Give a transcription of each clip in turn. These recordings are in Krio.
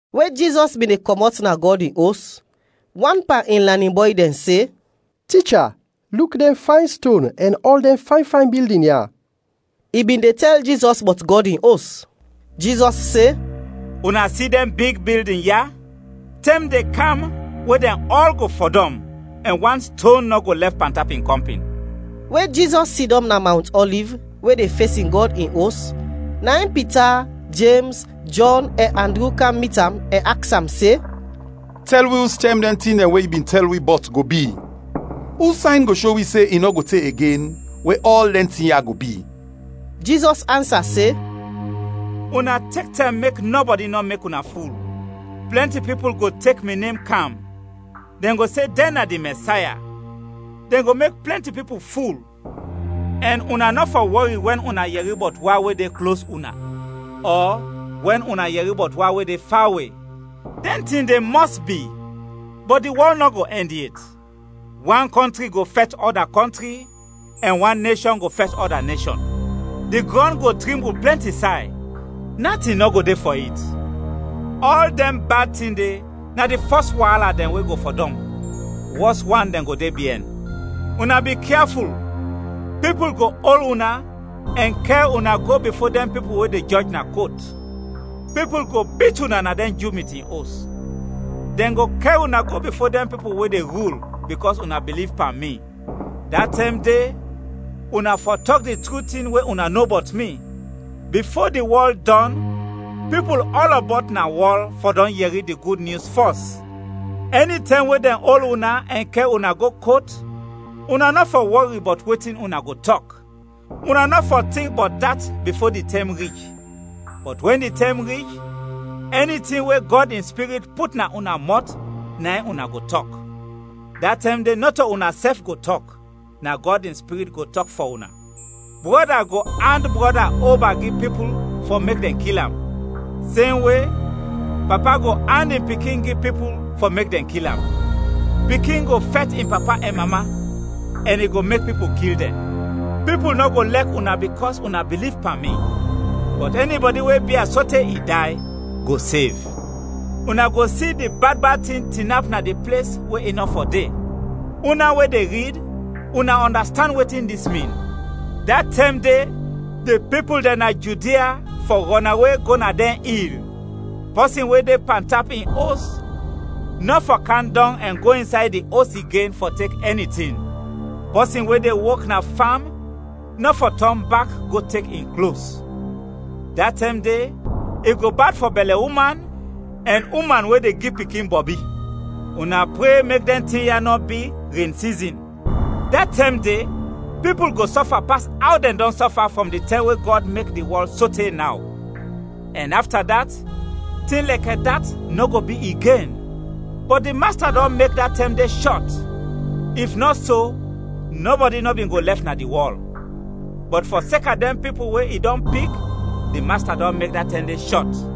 We Jizɔs bin de kɔmɔt na Gɔd in Os, wan pan in lanin bɔy dɛn se, “Ticha, luk dɛn fayn ston ɛn ɔl dɛn fayn fayn bildin ya!” I bin de tɛl Jizɔs bɔt Gɔd in Os. Jizɔs se, “Una si dɛn big bildin ya? Tɛm de kam we dɛn ɔl go fɔdɔm, ɛn wan ston nɔ go lɛf pantap in kɔmpin.” We Jizɔs sidɔm na Mawnt Ɔliv, we de fesin Gɔd in Os, na in Pita, Jems, Jɔn ɛn Andru kam mit am ɛn aks am se, “Tɛl wi ustɛm dɛn tin we yu bin tɛl wi bɔt go bi? Us sayn go sho wi se i nɔ go te igen we ɔl dɛn tin ya go bi?” Jizɔs ansa se, “Una tek tɛm mek nɔbɔdi nɔ mek una ful. Plɛnti pipul go tek mi nem kam, dɛn go se dɛn na di Mɛsaya, dɛn go mek plɛnti pipul ful. Ɛn una nɔ fɔ wɔri wɛn una yɛri bɔt wa we de klos una ɔ wɛn una yɛri bɔt wa we de fawe. Dɛn tin de mɔs bi, bɔt di wɔl nɔ go ɛnd yet! Wan kɔntri go fɛt ɔda kɔntri, ɛn wan neshɔn go fɛt ɔda neshɔn. Di grɔn go trimbul plɛnti say, natin nɔ go de fɔ it. Ɔl dɛn bad tin de na di fɔs waala dɛn we go fɔdɔm. Wɔs wan dɛn go de biɛn. “Una bikyaful, pipul go ol una ɛn kɛr una go bifo dɛn pipul we de jɔj na kot. Pipul go bit una na dɛn Ju mitin os; dɛn go kɛr una go bifo dɛn pipul we de rul, bikɔs una biliv pan mi; da tɛm de una fɔ tɔk di tru tin we una no bɔt mi. Bifo di wɔl dɔn, pipul ɔlɔbɔt na wɔl fɔ dɔn yɛri di Gud Nyus fɔs. Ɛnitɛm we dɛn ol una ɛn kɛr una go kot, una nɔ fɔ wɔri bɔt wetin una go tɔk, una nɔ fɔ tink bɔt dat bifo di tɛm rich, bɔt wɛn di tɛm rich, ɛni tin we Gɔd in Spirit put na una mɔt, na in una go tɔk. Da tɛm de nɔto unasɛf go tɔk, na Gɔd in Spirit go tɔk fɔ una. Brɔda go and brɔda oba gi pipul fɔ mek dɛn kil am, semwe, papa go and in pikin gi pipul fɔ mek dɛn kil am. Pikin go fɛt in papa ɛn mama, ɛn i go mek pipul kil dɛn. Pipul nɔ go lɛk una bikɔs una biliv pan mi, bɔt ɛnibɔdi we bia sote i day, go sev. “Una go si di bad bad tin tinap na di ples we i nɔ fɔ de.” (Una we de rid: una ɔndastand wetin dis min.) “Da tɛm de di pipul dɛn na Judia fɔ rɔnawe go na dɛn il, pɔsin we de pantap in os, nɔ fɔ kam dɔng ɛn go insay di os igen fɔ tek ɛni tin. Pɔsin we de wok na fam nɔ fɔ tɔn bak go tek in klos. Da tɛm de, i go bad fɔ bɛlɛ uman ɛn uman we de gi pikin bɔbi! Una pre mek dɛn tin ya nɔ bi ren sizin! Da tɛm de pipul go sɔfa pas aw dɛn dɔn sɔfa frɔm di tɛm we Gɔd mek di wɔl sote naw; ɛn afta dat, tin lɛkɛ dat nɔ go bi igen. Bɔt di Masta dɔn mek da tɛm de shɔt, if nɔ so, nɔbɔdi nɔ bin go lɛf na di wɔl. Bɔt fɔseka dɛn pipul we i dɔn pik, di Masta dɔn mek da tɛm de shɔt.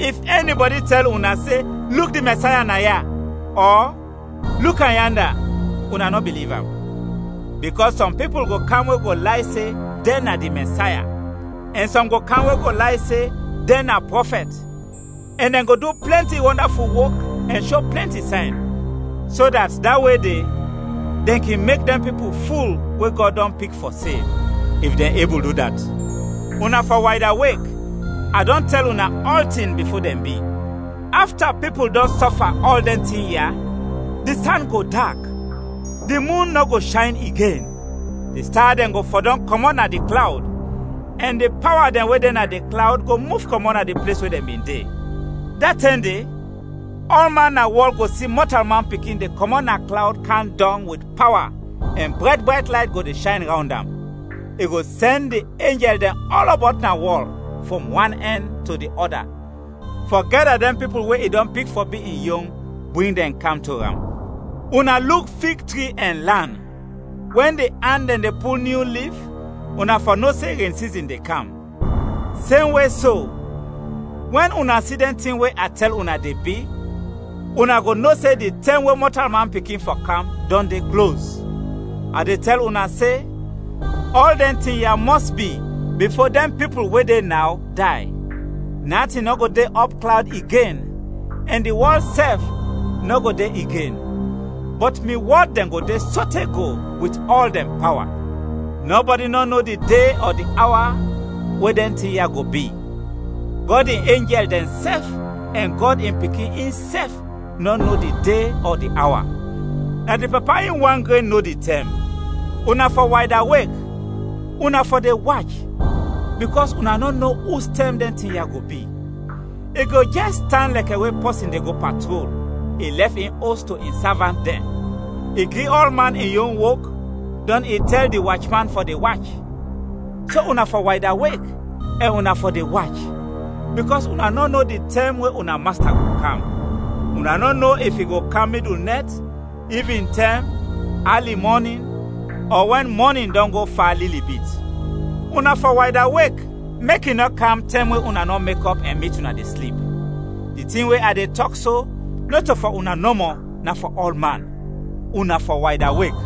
“If ɛnibɔdi tɛl una se, ‘Luk di Mɛsaya naya!’ ɔ ‘Luk am yanda!’, una nɔ biliv am. Bikɔs sɔm pipul go kam we go lay se dɛn na di Mɛsaya ɛn sɔm go kam we go lay se dɛn na prɔfɛt, ɛn dɛn go du plɛnti wɔndaful wok ɛn sho plɛnti sayn, so dat da we de, dɛn kin mek dɛn pipul ful we Gɔd dɔn pik fɔ sev, if dɛn ebul du dat. Una fɔ waydawek; a dɔn tɛl una ɔltin bifo dɛn bi. “Afta pipul dɔn sɔfa ɔl dɛn tin ya, di san go dak, di mun nɔ go shayn igen. Di sta dɛn go fɔdɔm kɔmɔt na di klawd, ɛn di pawa dɛn we de na di klawd go muf kɔmɔt na di ples we dɛn bin de. Da tɛm de, ɔlman na wɔl go si Mɔtalman Pikin de kɔmɔt na klawd kam dɔng wit pawa ɛn brayt brayt layt go de shayn rawnd am. I go sɛn di enjɛl dɛn ɔlɔbɔt na wɔl frɔm wan ɛnd to di ɔda fɔ gɛda dɛn pipul we i dɔn pik fɔ bi in yon, bring dɛn kam to am. “Una luk fig tik ɛn lan. Wɛn di an dɛn de pul nyu lif, una fɔ no se ren sizin de kam. Semwe so, wɛn una si dɛn tin we a tɛl una, de bi, una go no se di tɛm we Mɔtalman Pikin fɔ kam dɔn de klos. A de tɛl una se, ɔl dɛn tin ya mɔs bi, bifo dɛn pipul we de naw, day. Natin nɔ go de ɔpklawd igen ɛn di wɔl sɛf nɔ go de igen, bɔt mi wɔd dɛn go de sote go wit ɔl dɛn pawa. “Nɔbɔdi nɔ no di de ɔ di awa we dɛn tin ya go bi; Gɔd in enjɛl dɛnsɛf ɛn Gɔd in Pikin insɛf nɔ no di de ɔ di awa; na di Papa in wan gren no di tɛm. Una fɔ waydawek, una fɔ de wach, bikɔs una nɔ no ustɛm dɛn tin ya go bi. I go jɛs tan lɛkɛ we pɔsin de go patrol, i lɛf in os to in savant dɛn. I gi ɔlman in yon wok, dɔn i tɛl di wachman fɔ de wach. So una fɔ waydawek, ɛn una fɔ de wach, bikɔs una nɔ no di tɛm we una masta go kam; una nɔ no if i go kam midul nɛt, ivintɛm, ali mɔnin, ɔ wɛn mɔnin dɔn go fa lili bit. Una fɔ waydawek, mek i nɔ kam tɛm we una nɔ mekɔp ɛn mit una de slip. Di tin we a de tɔk so, nɔto fɔ una nɔmɔ, na fɔ ɔlman. Una fɔ waydawek!”